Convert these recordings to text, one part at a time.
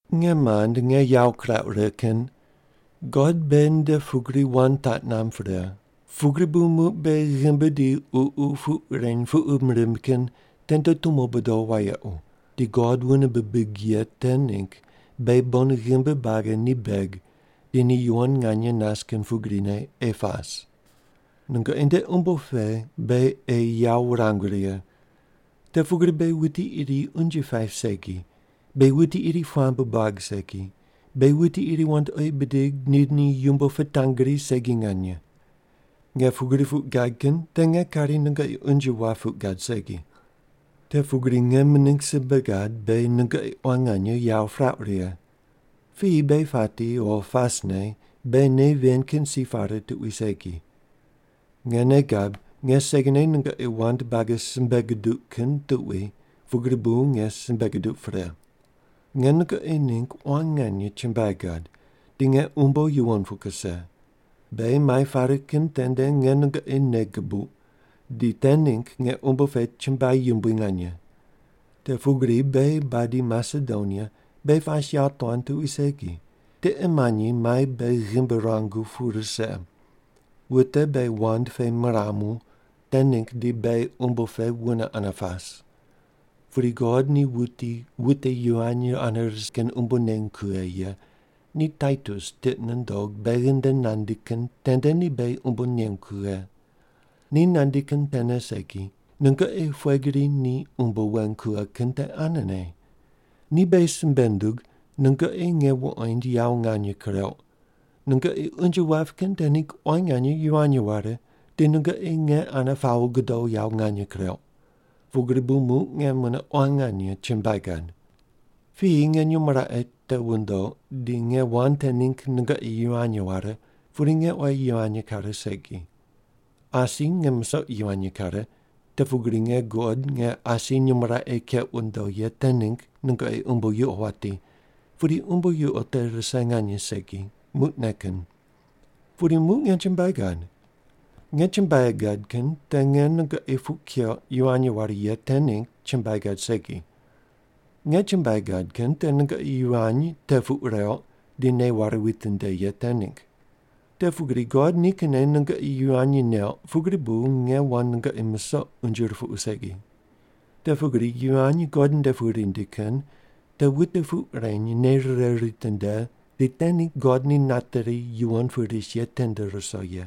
Nge mand nge yawo kirauq righe kin, God beghi nde pugri wand taq namb pre, pugri bu muq beghi ghimbi di ququ puq reny puqum rimb kin tende tumo bodo wayequ, di God wune bibig ye te ningg beghi bon ghimbi buagi ni beg di ni yuwon nganye nas kin pugrine ei pas. Nungoqi nde umbo pe beghi ei yawo wurangu righe. Te pugri beghi wuti iri unje paip segi, beghi wuti iri puamb buag segi, beghi wuti iri wandoqi bidig di ni yumbo pitangri segi nganye. Nge pugri puq gad kin te nge kari nungoqi unje wap puq gad segi. Te pugri nge mining simbe gad, beghi nungoqi quan nganye yawo pirauq righe. Piyi beghi pati o pasne beghi nei ven kin si pare tuqui segi. Nge nei gab nge segine nungoqi wand buagi simbe guduq kin tuqui pugri bu nge simbe guduq pre. Nge nungoqi ningg quan nganye chumbuai gad, di nge umbo yuwon pu kuse. Beghi mai pare kin tende nge nungoqi nei gubuq, di te ningg nge umbo pe chumbuai yumbui nganye. Te pugri beghi badi Masedonia, beghi pas yawotuan tuqui segi, tiqe manyi mai beghi ghimbi ruangu pu rise. Wute beghi wand pe miramu, te ningg di beghi umbo pe wune ane pas. Pudi God ni wuti wute yivany ane ris kin umbo neny kughe ye ni Taitus tiqi nundog beghi nde nandi kin tende ni beghi umbo nengu kughe. Ni nandi kin tene segi, nungoqi pughe gri ni umbo weng kughe kin te anene. Ni beghi simbe nundug nungoqi nge wuqoind yawo nganye kureuq, nungoqi unje wap kin te ningg quan nganye yivany ware, di nungoqi nge ane pawo gudo yawo nganye kureuq. Pugri bu muq nge mune quan nganye chumbuai gad. Piyi nge nyumo raqe te wundoq di nge wand te ningg nungoqi yivany ware pudi nge oyi yivany kare segi. Asi nge musoq yivany kare, te pugri nge guqod nge asi nyumo raqe keq wundo ye te ningg nungoqi umbo yuqo wati, pudi umbo yuqo te rise nganye segi, muqne kin. Pudi muq nge chumbuai gad. Nge chumbuai gad kin te nge nungoqi puq keuq yivany ware ye te ningg chumbuai gad segi. Nge chumbuai gad kin te nungoqi yivany te puq reuq di nei ware witinde ye te ningg. Te pugri God nikinne nungoqi yivany neuq pugri bu nge wand nungoqi musoq unje rupuqu segi. Te pugri yivany God nde pu rindi kin te wute puq reny nei rire ritinde di te ningg God ni nateri yuwon pu ris ye tende ruso ye.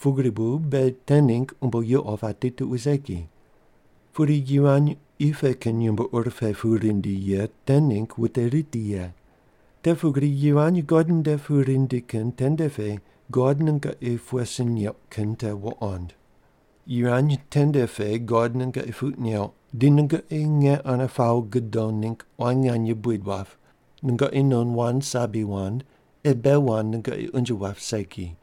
Pugri bu beghi te ningg umbo yuqo pati tuqui segi. Pudi yivany qi pe kin yumbo ur pe pu rindi ye te ningg wute riti ye. Te pugri yivany God nde pu rindi kin tende pe God nungoqi pughe sin neuq kin te wuqond. Yivany tende pe God nungoqi puq neuq di nungoqi nge ane pawo gudo ningg quan nganye buid wap, nungoqi non wand sabi wand ei bei wand nungoqi unje wap segi,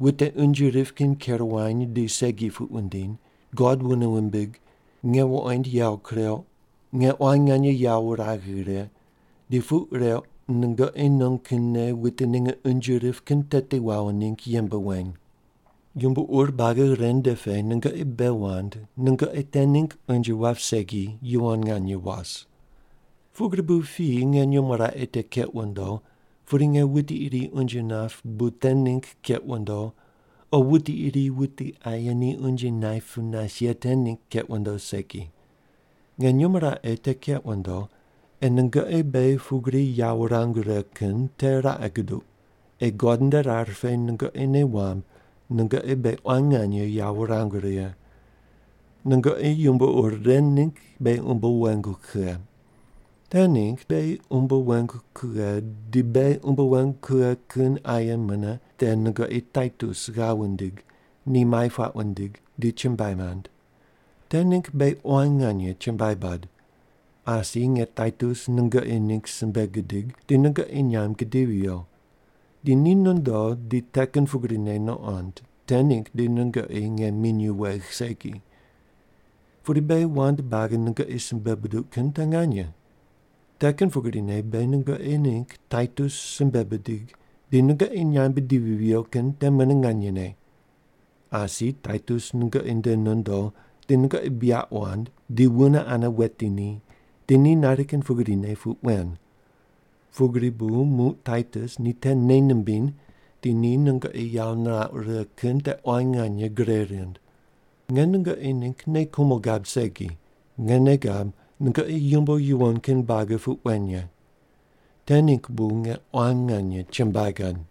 wute unje rip kin ker wany di segi puq wundiny, God wune wumbig, nge wuqoind yawo kureuq, nge quan nganye yawo wuragh righe, di puq reuq nungoqi non kinne wute ninge unje rip kin teti wawo ningg yembe weny. Yumbo ur buagi ren nde pe nungoqi bei wand nungoqi te ningg unje wap segi yuwon nganye was. Pugri bu piyi nge nyumo raqe te keq wundo pudi nge wuti iri unje nap bu te ningg keq wundo o wuti iri wuti aye ni unje naip pu nas ye te ningg keq wundo segi. Nge nyumo raqe te keq wundo ei nungoqi beghi pugri yawo wurangu righe kin te raqe guduq ei God nde rar pe nungoqi nei wamb nungoqi beghi quan nganye yawo wurangu righe. Nungoqi yumbo ur ren ningg beghi umbo wengu kughe. Te ningg beghi umbo wengu kughe di beghi umbo wengu kughe kin aye mune te nungoqi Taitus ghav wundig ni mai puaq wundig di chumbuai nand. Te ningg beghi quan nganye chumbuai bad. Asi nge Taitus nungoqi ningg simbe gidig di nungoqi nyamb gidivi viyo, di ni nondo di te kin pugrine nuqond te ningg di nungoqi nge minyuw wegh segi. Pudi beghi wand buagi nungoqi simbe buduq kin te nganye. Te kin pugrine beghi nungoqi ningg Taitus simbe bidig di nungoqi nyamb bidivi viyo kin te mune nganyene. Asi Taitus nungoqi nde nondo di nungoqi buyaq wand di wune ane weti ni di ni nari kin pugrine puq wen. Pugri bu muq Taitus ni te nei nimbiny di ni nungoqi yawo nirauq righe kin te quan nganye gre rind. Nge nungoqi ningg nei kumo gab segi, nge nei gab nungoqi yumbo yuwon kin buagi puq wen ye. Te ningg bu nge quan nganye chumbuai gad.